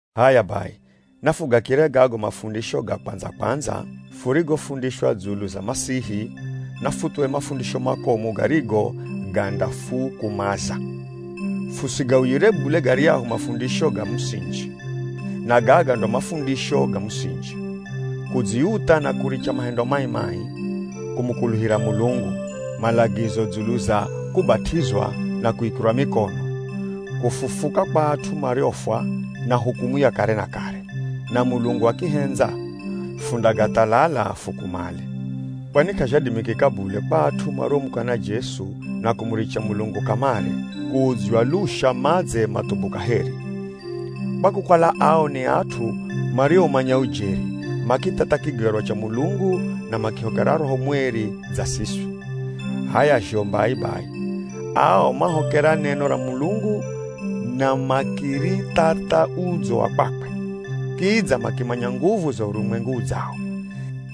H'aya bai, nafugakire gago mafundisho ga kwandza-kwandza furigofundishwa dzulu za Masihi, na futhuwe mafundisho makomu garigo gandafukumaza. Fusigauyire bule garyahu mafundisho ga musinji. Na gaga ndo mafundisho ga musinji: Kudziutha na kuricha mahendo mai-mai, kumukuluhira Mulungu, malagizo dzulu za kubat'izwa na kuikirwa mikono, kufufuka kwa at'u mariofwa, na hukumu ya kare na kare. Na Mulungu akihendza, fundagathalala fukumale. Kwani k'azhadimikika bule kwa at'u mariomukana Jesu na kumuricha Mulungu kamare, kuudzywa lusha madze mathubu kaheri. Kwa kukala ao ni at'u marioumanya ujeri, makithatha kigerwa cha Mulungu na makihokera Roho Mweri dza siswi. H'aya zho mbai bai, ao mahokera neno ra Mulungu na makirithatha udzo wa kwakwe, kidza makimanya nguvu za urumwengu udzawo.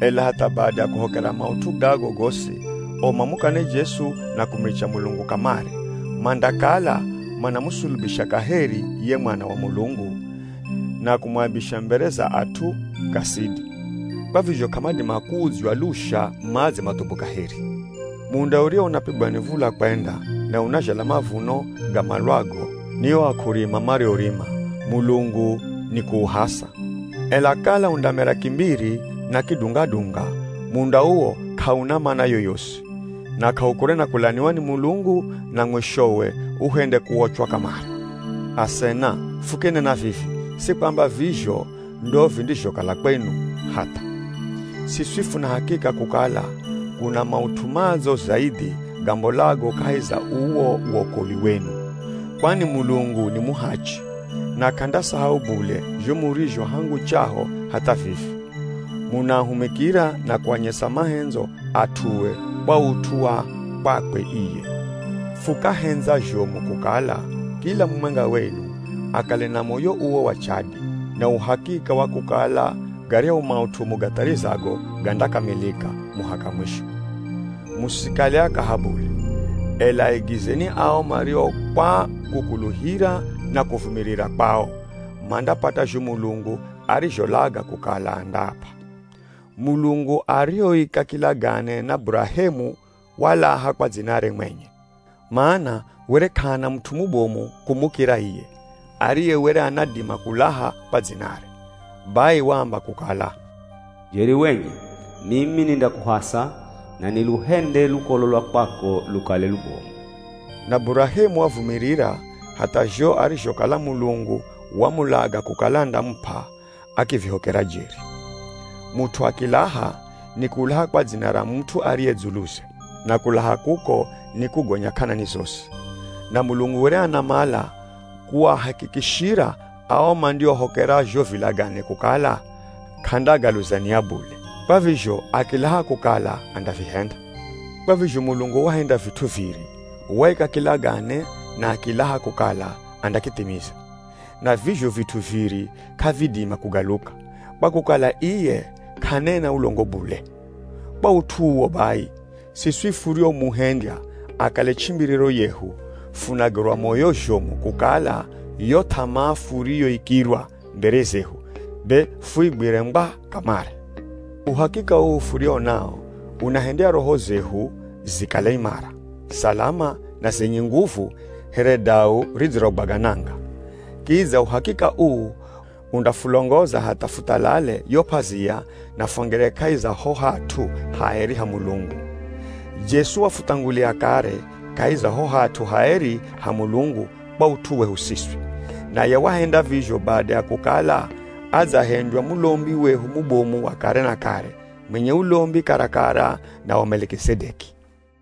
Ela hatha bada ya kuhokera maut'u gago gosi, o mamukane Jesu na kumuricha Mulungu kamare, mandakala manamusulubisha kaheri ye Mwana wa Mulungu, na kumuaibisha mbere za at'u, kasidi. Kwa vizho k'amadima kuudzywa lusha madze mathubu kaheri. Munda uriwo unapigwa ni v̱ula kwenda na unazhala mavuno gamalwago ni o ak'urima mariourima, Mulungu ni kuuhasa. Ela kala undamera kimbiri na kidunga-dunga, munda uwo k'auna mana yoyosi, na k'aukure na kulaniwa ni Mulungu na mwishowe uhende kuochwa kamare. Asena, fukinena vivi, si kwamba vizho ndo vindizhokala kwenu, hatha. Siswi funa hakika kukala kuna maut'u madzo zaidhi gambolago kahi za uwo wokolwi wenu. Kwani Mulungu ni muhachi na k'andasahau bule zho murizho hangu chaho hatha vivi, munaahumikira na kuanyesa mahendzo at'ue kwa ut'u wa kwakwe iye. Fukahendza zhomu kukala, kila mumwenga wenu, akale na moyo uwo wa chadi, na uhakika wa kukala garyahu maut'u mugatharizago gandakamilika, muhaka mwisho. Musikale akaha bule, ela aigizeni ao mario kwa kukuluhira na kuvumirira kwao mandapata zho Mulungu arizholaga kukala andaap'a. Mulungu arihoika kilagane na Burahemu walaha kwa dzinare mwenye, mana were k'ahana mut'u mubomu kumukira iye, ariye were anadima kulaha kwa dzinare. Bai waamba kukala, “Jeri wenye mimi nindakuhasa na niluhende lukolo lwa kwako lukale lubomu.” Na Burahemu wavumirira hatha zho arizhokala Mulungu wamulaga kukala andamup'a, akivihokera jeri. Mut'u akilaha, nikulaha kwa dzina ra mut'u ariye dzuluze, na kulaha kuko nikugonya k'anani zosi. Na Mulungu were anamala kuahakikishira ao mandiohokera zho vilagane kukala k'andagaluza nia bule. Kwa vizho akilaha kukala andavihenda. Kwa vizho Mulungu wahenda vit'u viri, waika kilagane na akilaha kukala andakithimiza. Na vizho vit'u viri k'avidima kugaluka, kwa kukala iye k'anena ulongo bule. Kwa ut'u uwo bai, siswi furiomuhendya akale ch'imbiriro yehu, funagerwa moyo zhomu kukala yo th'amaa furiyoikirwa mbere zehu be fuigwire ngwa kamare. Uhakika uu furiwo nawo unahendya roho zehu zikale imara, salama, na zenye nguvu here dau ridzirogwaga nanga. Kidza uhakika uu undafulongoza hatha futhalale yo p'azia na fwangire kahi za ho hat'u haeri ha Mulungu. Jesu wafuthangulia kare kahi za ho hat'u haeri ha Mulungu kwa ut'u wehu siswi. Naye wahenda vizho bada ya kukala adzahendywa mulombi wehu mubomu wa kare na kare, mwenye ulombi karakara na wa Melikizedeki.